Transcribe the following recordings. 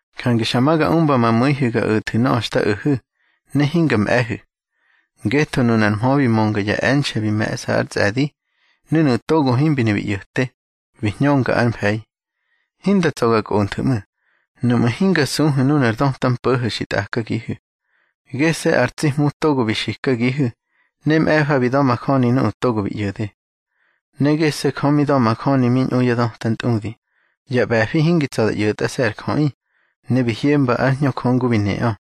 Jange xa ma ga umba ma mu̱ihu̱ ga o̱thu̱ nöꞌö xta o̱hu̱, ne hinga mꞌe̱hu̱. Ngetho nunar mhö bi mönga ya e̱nxe̱ bi me̱ꞌsa ár tsꞌe̱di, ne nuꞌu̱ togo himbi ne bi ꞌyo̱te, bi hñönga ár mfe̱i. Hinda tsa̱ ga kꞌonthu̱ ꞌmu̱, nuꞌmu̱ hinga suhu̱ nunar döta mpo̱ho̱ xi tꞌakagihu̱. Gese̱ ar tsi Hmu togo bi xikagihu̱, ne mꞌe̱fa bi da̱majöni nuꞌu̱ togo bi ꞌyo̱de. Ne gese̱ Jö mi da̱majöni mi ñꞌu ya döta ntꞌudi, ya ꞌbe̱fi hingi tsa̱ da ꞌyo̱tꞌase̱ ar jöꞌi, ne bi hyemba ár Hñö Jö ngu bi neꞌö.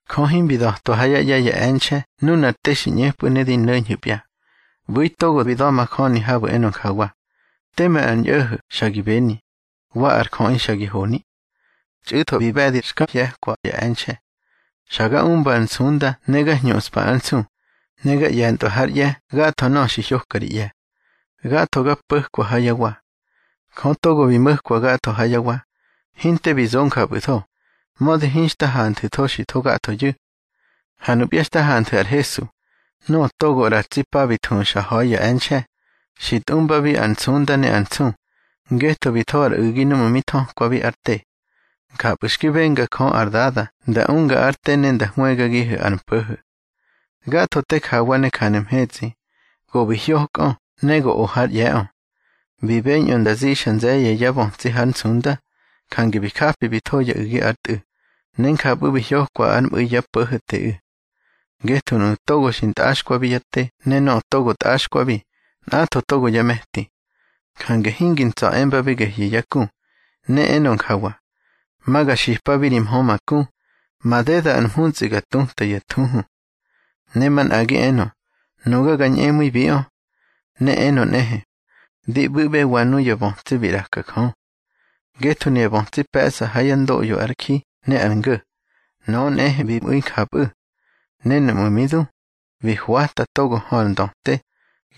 Jö himbi da̱twa ha yá ꞌye̱ ya e̱nxe̱ nunar te xi ꞌñepꞌu̱ ne di no̱ñhu̱pya. ꞌBu̱i togo bi da̱majöni habu̱ enö njawa: Teme ar ñꞌo̱ho̱ xa gi beni, wa ar jöꞌi xa gi honi. Txꞌu̱tho bi ꞌbe̱di xka hye̱kwa ya e̱nxe̱. Xa ga umba ar nsunda ne ga hñuꞌspa ár nsu, ne ga ꞌye̱ntꞌwa hár ꞌye̱ gatho nöꞌö xi hyoka ri ꞌye̱. Gatho ga po̱kwa ha yá wa. Jö togo bi mo̱kwa gatho ha yá wa, hinte bi zo njapꞌu̱tho, mödi hinxta hanthu̱tho xi tho gathoyu̱. Ha nupya xta hanthu̱ ar Hesu, nöꞌö togo ꞌra ya tsi pa bi thuxa ha̱i ya e̱nxe̱, xi tꞌumbabi ar nsunda ne ar nsu, ngetho bi tho ar u̱gi núꞌmu̱ mi thökwabi ár te. Njapꞌu̱ xki benga Jö ar Dada nda unga ár te ne nda hwëgagihu̱ ar mpo̱ho̱. Gatho te jawa ne janu̱ mhetsꞌi, go bi hyokꞌö ne go o hár ꞌye̱ꞌö. Bi beñꞌö nda zixa nze̱ye̱ yá bötsi hár nsunda, jange bi japi bi tho ya u̱gi ár Tꞌu̱, ne njapꞌu̱ bi hyokwa ár mꞌu̱i yá Po̱ho̱teꞌu̱. Ngetho nuꞌu̱ togo xi ntꞌaxkwabi yá te ne nöꞌö togo tꞌaxkwabi, nꞌatho togo yá me̱ti. Jange hingi ntsa̱ embabi gehyu̱ yá ku. Ne enö njawa: Ma ga xipabi ri mhö ma ku, Madeda ar mhuntsꞌi ga tutꞌa ya thuhu. Ne manꞌagi enö: Nuga ga ñꞌemu̱ibiꞌö. Ne enö nꞌehe: Di ꞌbu̱ꞌbewa nuya bötsi bi ꞌraka Jö. Ngetho nuya bötsi pe̱ꞌsa ha yá ndoꞌyo ar ji ne ar ngo̱, nöꞌö nꞌehe bi mꞌu̱i njapꞌu̱. Ne núꞌmu̱ mi du, bi hwata togo hö ar ndöte,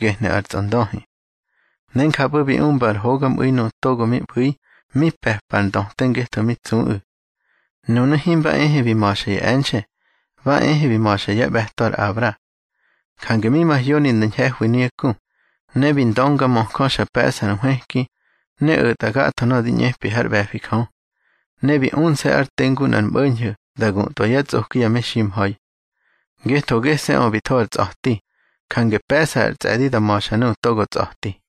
gehnu̱ ar tsꞌondöhi. Ne njapꞌu̱ bi umba ar hogamꞌu̱i nuꞌu̱ togo mi ꞌbu̱i mi pe̱pa ar ndöte ngetho mi tsuꞌu̱. Nunu̱ himba ehe bi ma̱xa ya e̱nxe̱, ba ehe bi ma̱xa yá ꞌbe̱to ar Abra. Jange mi mahyoni nda ñhe̱hwi nuyá ku. Ne bi ndöngamöjö xa pe̱ꞌsa ar nhwëki, ne o̱tꞌa gatho nöꞌö di ꞌñepi hár ꞌbe̱fi Jö. Ne bi unse̱ ár te ngu nꞌar mꞌo̱ñho̱ da gutꞌwa yá tsꞌoki ya meximha̱i. Ngetho gese̱ꞌö bi tho ar tsꞌa̱ti, jange pe̱ꞌsa ar tsꞌe̱di da ma̱xa nuꞌu̱ togo tsꞌa̱ti.